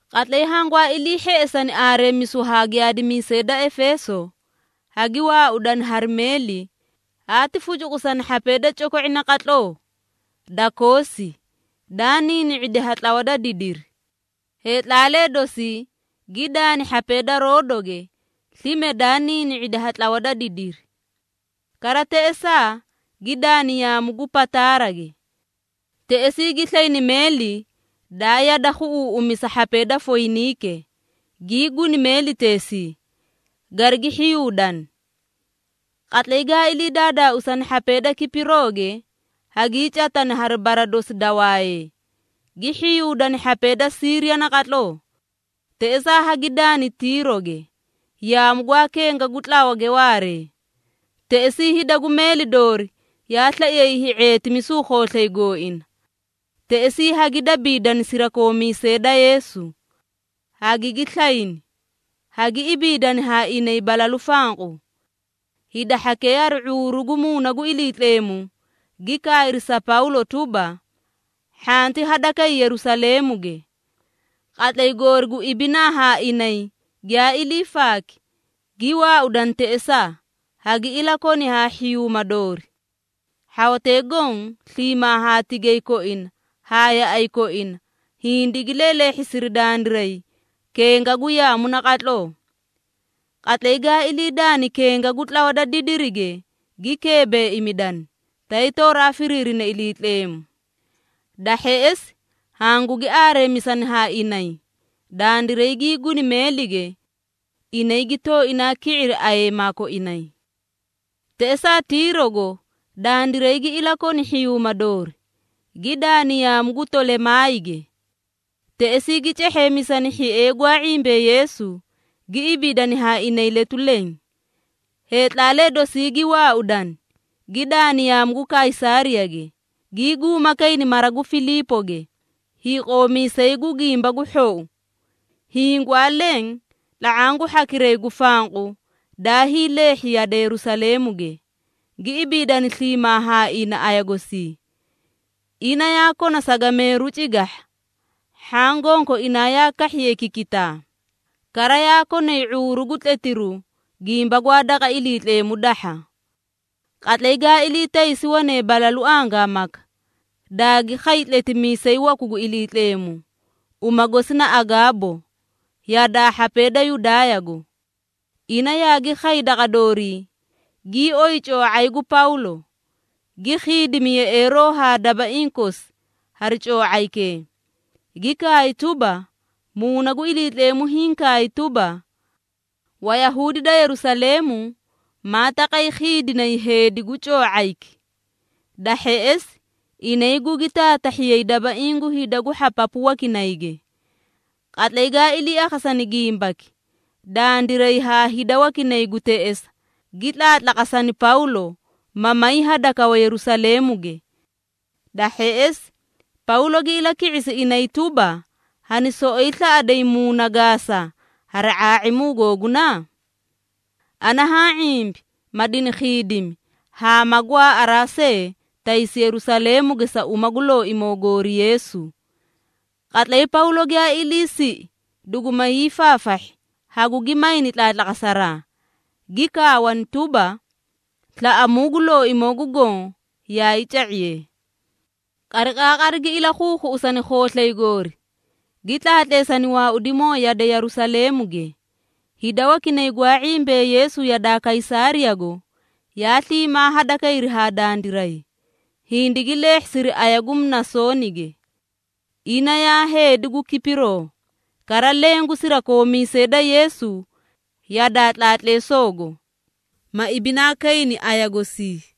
Qatlay hangwaa ilii hheꞌesani aareemisu haa giyaadimiisee da Efeeso, hagi waaudani hari meeli haati fucuqusani hhapee da coko⁄i naqatloo da Koosi, daa niini⁄idi ha tlawa da didiri. Heetlaalee dosii gi daani hhapee da Roodoge slime daa niini⁄idi ha tlawa da didiri. Kara teꞌesaa gi daani yaamu gu Pataarage. Teꞌesii gi slayni meeli daa yade khuꞌuuꞌumisa hhapee da Foyiniike, gii guni meeliteesii, garigi hhiyuudani. Qatlay gaa ilii daadaausani hhapee da Kipirooge, hagii catani hari bara dosi da wayee, gi hhiyuudani hhapee da Siiriya naqatloo. Teꞌesaa hagi daani Tiiroge, yaamu gwaa kenga gu tlawage waaree. Teꞌesii hida gu meeli doori yaa slaiyay hii⁄eetimisu khooslay gooina. Teꞌesii hagi dabiidani sirakoomiisee da Yeesu, hagigi slayni, hagi ibiidani haa inay balalu fanqu. Hida hhakee hari ⁄uuru gu Muuna gu Iliitleemu gi kaayri sa Pawlo tuba, hhanti hadakay Yerusaleemuge. Qatlay goori gu ibinaa haa inay giyaa ilii faaki, gi waaudani teꞌesaa, hagi ilakoni haa hhiyuuma doori. Hhawatee goõ sliimaa haa tigay koina haa yaꞌay koina hindigi leeleehhisiri dandiray kenga gu yaamu naqatloo. Qatlay gaa ilii daani kenga gu tlawa da didirige gi keebeꞌemidani, tay tooraa firiirina Iliitleemu. Da hheꞌesi hangugi aareemisani haa inay, dandiray gii guni meelige. Inay gi tooinaa ki⁄iri ayeema koinay. Teꞌesaa Tiirogo dandiray gi ilakoni hhiyuuma doori, gi daani yaamu gu Tolemaayige. Teꞌesii gi cehheemisani hhiee gwaa ⁄imbee Yeesu, gi ibiidani haa inay letu leẽ. Heetlaalee dosii gi waaudani, gi daani yaamu gu Kaysaariyage, gii guuma kayni mara gu Filiipoge, hiiqoomiisay gu Gimba gu Hhou. Hiĩ gwaa leẽ tla⁄aã gu hhakiray gu fanqu daa hiileehhi yade Yerusaleemuge, gi ibiidani sliimaa haa ina aya gosii. Ina yaa kona sagameeru cigahha. Hhaã gonkoinaa yaa kahhiyay kikitaa, kara yaa konay ⁄uuru gu tletiruu gimba gwaa daqa Iliitleemu dahha. Qatlay gaa ilii taysi wane balalu angaamaka, daagi khay tletimiisay waku gu Iliitleemu, uma gosi na Agaabo yadaa hhapee da Yudaayago. Ina yaagi khay daqa doorii, gii oyi coo⁄ay gu Pawlo, gi khiidimi yeꞌeeroo haa dabaiĩ kosi hari coo⁄aykee, gi kaay tuba, “Muuna gu Iliitleemu hiĩ kaay tuba, ‘Wayahuudi da Yerusaleemu, maa taqay khiidinay heedi gu coo⁄ayki. Da hheꞌesi inay gugi taatahhiyay dabaiĩ gu hida gu hhapapu wakinayge.’” Qatlay gaa ilii akhasani gimbaki dandiray haa hida wakinay gu teꞌesa, gi tlaatlaqasani Pawlo, ma may hadakawa Yerusaleemuge. Da hheꞌesi Pawlo gi ilaki⁄isi inay tuba, “Hani soꞌoyi slaꞌaday muuna gaasa hari ⁄aa⁄imu googuna? Ana haã ⁄imbi ma dini khiidimi haa ma gwaaꞌaraa see taysi Yerusaleemuge sa uma gu Looimoo goori Yeesu.” Qatlay Pawlo giyaa iliisiꞌi duguma hiifaafahhi, hagugi mayni tlaatlaqasaraa, gi kaawani tuba, “Slaꞌamuu gu Looimoo gu Goõ yaay ca⁄iyee.” Qariqaaqari gi ilakhuukhuꞌusani khooslay goori, gi tlaatleesani waaudimoo yade Yerusaleemuge. Hida wakinay gwaa ⁄imbee Yeesu yadaa Kaysaariyago, yaa sliimaa hadakayri haa dandiray, hindigi leehhisiri aya gu Mnasoonige. Ina yaa heedi gu Kipiroo, kara leẽ gu sirakoomiisee da Yeesu yadaa tlaatleesoogo, ma ibinaa kayni aya gosii.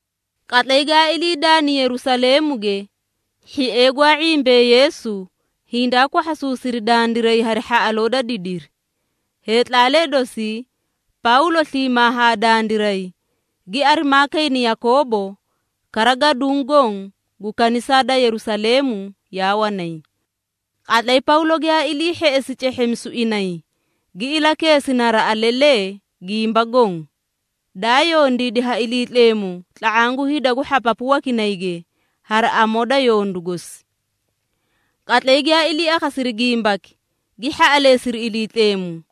Qatlay gaa ilii daani Yerusaleemuge, hhiee gwaa ⁄imbee Yeesu hindaa kwahhasuusiri dandiray hari hhaꞌaloo da didiri. Heetlaalee dosii Pawlo sliimaa haa dandiray, gi arimaa kayni Yakoobo, kara gaduũ goõ gu kanisaa da Yerusaleemu yaa wanay. Qatlay Pawlo giyaa ilii hheꞌesi cehheemisu inay, gi ilakeesi naraꞌa lelee gimba goõ, daa yondiidi ha Iliitleemu tla⁄aã gu hida gu hhapapu wakinayge hari amoo da yondu gosi. Qatlay giyaa ilii akhasiri gimbaki, gi hhaꞌaleesiri Iliitleemu.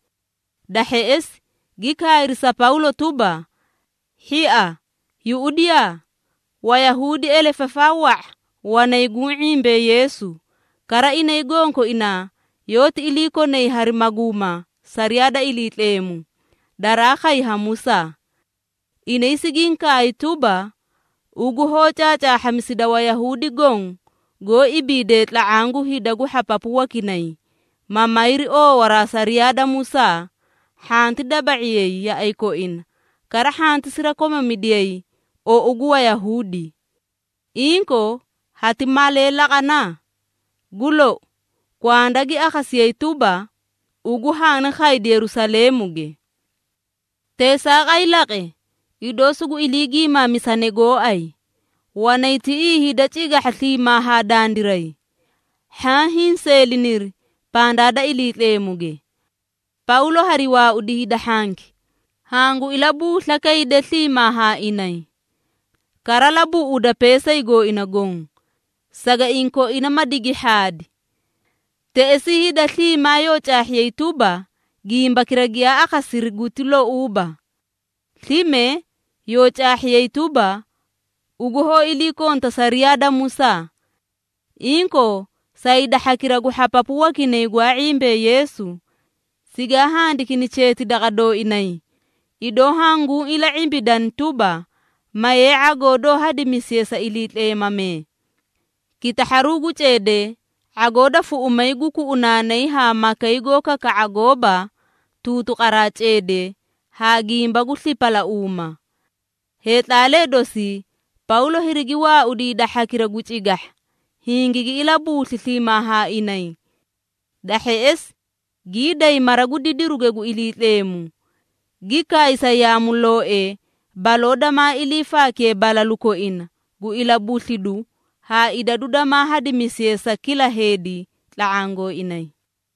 Da hheꞌesi gi kaayri sa Pawlo tuba, “Hhia, yuꞌudiyaa! Wayahuudi elefafaa wa⁄a wanay guũ ⁄imbee Yeesu, kara inay gonkoinaa yoóti iliikonay hari maguuma sariyaa da Iliitleemu, daraa khay ha Musaa. Inay sigiĩ kaay tuba, ugu hoó caacaahhamisida Wayahuudi goõ goó ibiidee tla⁄aã gu hida gu hhapapu wakinay, ma mayri oowaraa sariyaa da Musaa, hhanti daba⁄iyay yaꞌay koina, kara hhanti sirakomamidiyay ou gu Wayahuudi. Inkoo, hati malee laqana? Gu lou, kwanda gi akhasiyee tuba, ugu haani khaydi Yerusaleemuge. Teesaaqay laqe, idoo sugu ilii giimaamisane gooay. Wanay tiꞌii hida cigahha sliimaa haa dandiray. Hhaã hinseeliniri pandaa da Iliitleemuge. Pawlo hariwaaudi hida hhanki, hangu ilabuusla kayde sliimaa haa inay. Kara labuꞌuda peesay gooina goõ, sagaiĩ koina ma digi hhaadi. Teꞌesii hida sliimaa yoo caahhiyay tuba, gimbakira giyaa akhasiri guti louuba. Slime, yoo caahhiyay tuba, ugu hoó iliikonta sariyaa da Musaa. Inkoo, sa hida hhakira gu hhapapu wakinay gwaa ⁄imbee Yeesu, sigaa handikini cheeti daqa dooinay, idoo hanguũ ila⁄imbidani tuba, mayee ⁄agoo doó hadimisiye sa iliitleemamee, kitahharu gu ceedee, ⁄agoo da fuꞌumay gu kuꞌunaanay haa makay goó kaka⁄a goóba tuutuqaraa ceedee haa gimba gu slipalauuma.” Heetlaalee dosii Pawlo hirigi waaudi hida hhakira gu cigahha, hingigi ilabuusli sliimaa haa inay. Da hheꞌesi gii day mara gu didiruge gu Iliitleemu, gi kaay sa yaamulooee baloo damaa ilii faakiye balalu koina gu ilabuslidu haa idadu damaa hadimisiye sa kila heedi tla⁄aã gooinay.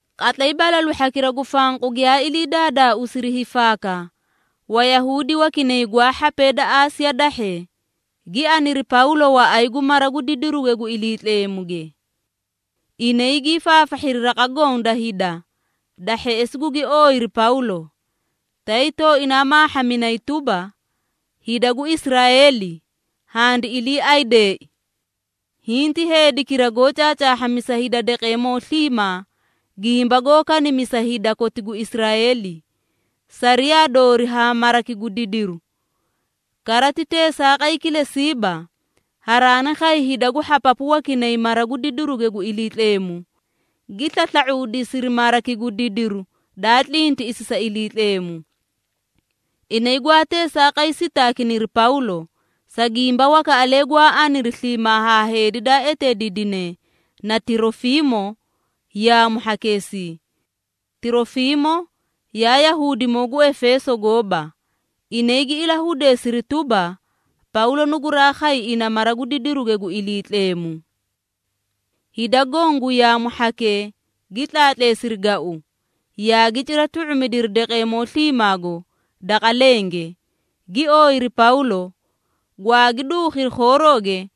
Qatlay balalu hhakira gu fanqu giyaa ilii daadaauusiri hiifaaka, Wayahuudi wakinay gwaa hhapee da Aasiya dahhee, gi aniri Pawlo waꞌay gu mara gu didiruge gu Iliitleemuge. Inay gii faafahhiri raqa goõ da hida, da hheꞌesi gugi ooyiri Pawlo, tay tooinaa maahhaminay tuba, “Hida gu Israeeli, handi iliiaydee! Hiĩ ti heedikira goó caacaahhamisa hida daqeemoo sliimaa, gimba goó kanimisa hida koti gu Israeeli, sariyaa doori haa maraki gu didiru. Kara ti teesaaqay kilesiiba, haraani khay hida gu hhapapu wakinay mara gu didiruge gu Iliitleemu, gi slasla⁄uudisiri maraki gu didiru daa tlintiꞌisi sa Iliitleemu.” (Inay gwaa teesaaqay sitaakiniri Pawlo, sa gimba wakaꞌalee gwaa aniri sliimaa haa heedi daa eteediidine na Tirofiimo yaamu hhakeesii. Tirofiimo yaa Yahuudimoo gu Efeeso gooba. Inay gi ilahudeesiri tuba, Pawlo nuguraa khay ina mara gu didiruge gu Iliitleemu.) Hida goõ gu yaamu hhakee gi tlaatleesiri gau, yaagi cira tu⁄umidiri daqeemoo sliimaago daqa lenge, gi ooyiri Pawlo, gwaagi duukhiri khoorooge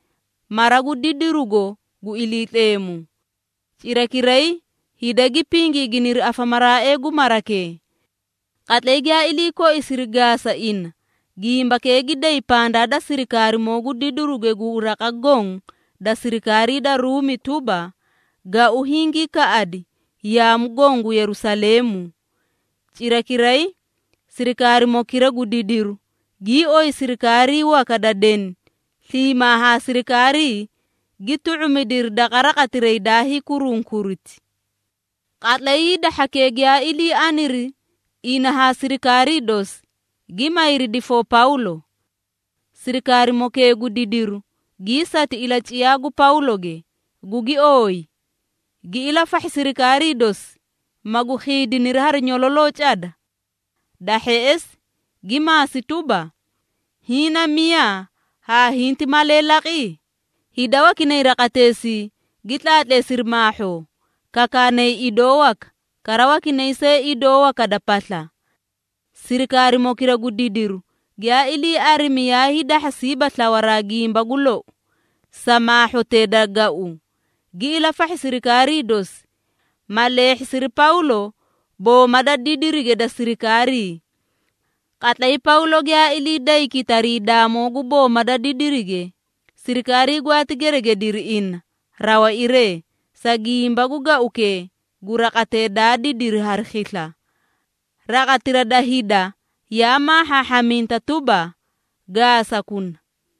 mara gu didirugo gu Iliitleemu. Cirakiray hida gi pingiiginiri afamaraaee gu marakee. Qatlay giyaa ilii koisiri gaasa ina, gimbakee gi day pandaa da sirikaarimoo gu didiruge gu raqa goõ da sirikaarii da Ruumi tuba, gau hingii kaꞌadi yaamu goõ gu Yerusaleemu. Cirakiray sirikaarimokira gu didiru gii oyi sirikaarii waka da deni sliimaa haa sirikaarii, gi tu⁄umidiri daqa raqatiray daa hiikurunkuriti. Qatlay hida hhakee giyaa ilii aniri ina haa sirikaarii dosi, gi mayri difoo Pawlo. Sirikaarimokee gu didiru gii sati ilaciyaa gu Pawloge, gugi ooyi, gi ilafahhi sirikaarii dosi, magu khiidiniri hari nyololoo cada. Da hheꞌesi gi maasi tuba, “Hiĩ na miyaa, haa hinti malee laqi?” Hida wakinay raqateesii gi tlaatleesiri maahhoo, kakaanay idoo waka, kara wakinay see idoo waka da pasla. Sirikaarimokira gu didiru giyaa ilii arimi yaa hiidahhasiiba slawaraa gimba gu lou, sa maahhotee da gau, gi ilafahhi sirikaarii dosi, ma leehhisiri Pawlo booma da didirige da sirikaarii. Qatlay Pawlo giyaa ilii day kitariidaamoo gu booma da didirige, sirikaarii gwaati geregediri ina rawairee, sa gimba gu gaukee gu raqatee daa didiri hari khisla. Raqatira da hida yaa maahhaahhaminta tuba, “Gaasakuna!”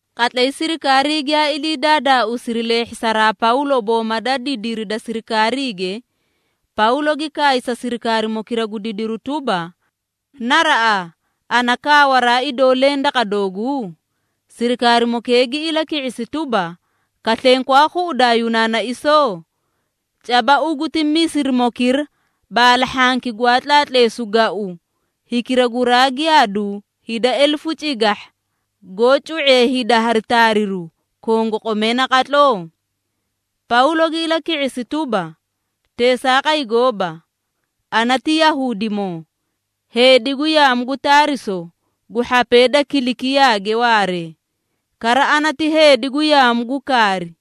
Qatlay sirikaarii giyaa ilii daadaauusiri leehhisaraa Pawlo booma da didiri da sirikaariige, Pawlo gi kaay sa sirikaarimokira gu didiru tuba, “Naraꞌaa, ana kaawaraa idoo leẽ daqa dooguu?” Sirikaarimokee gi ilaki⁄isi tuba, “Kaslenkwaa khuꞌudaa Yunaanaisoo? Caba ugu ti Misirimokira baalahhanki gwaa tlaatleesu gau, hikira guraa giyaadu hida elefu cigahha, goó cu⁄ee hida hari taariru, kongoqomee naqatloo?” Pawlo gi ilaki⁄isi tuba, “Teesaaqay gooba! Ana ti Yahuudimoo, heedi gu yaamu gu Taariso gu hhapee da Kilikiyaage waaree, kara ana ti heedi gu yaamu gu kaari.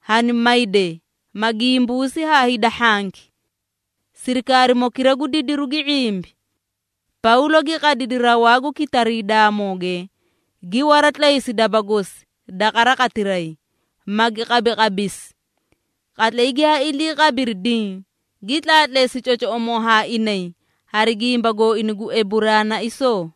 Hani mayde, ma gimbuusi haa hida hhanki.” Sirikarimokira gu didiru gi ⁄imbi. Pawlo gi qadidi rawaa gu kitariidaamooge, gi waratlaysi daba gosi daqa raqatiray, magi qabaqabisi. Qatlay giyaa ilii qabiri diĩ, gi tlaatleesi cocoꞌomoo haa inay hari gimba gooina gu Eburaanaisoo.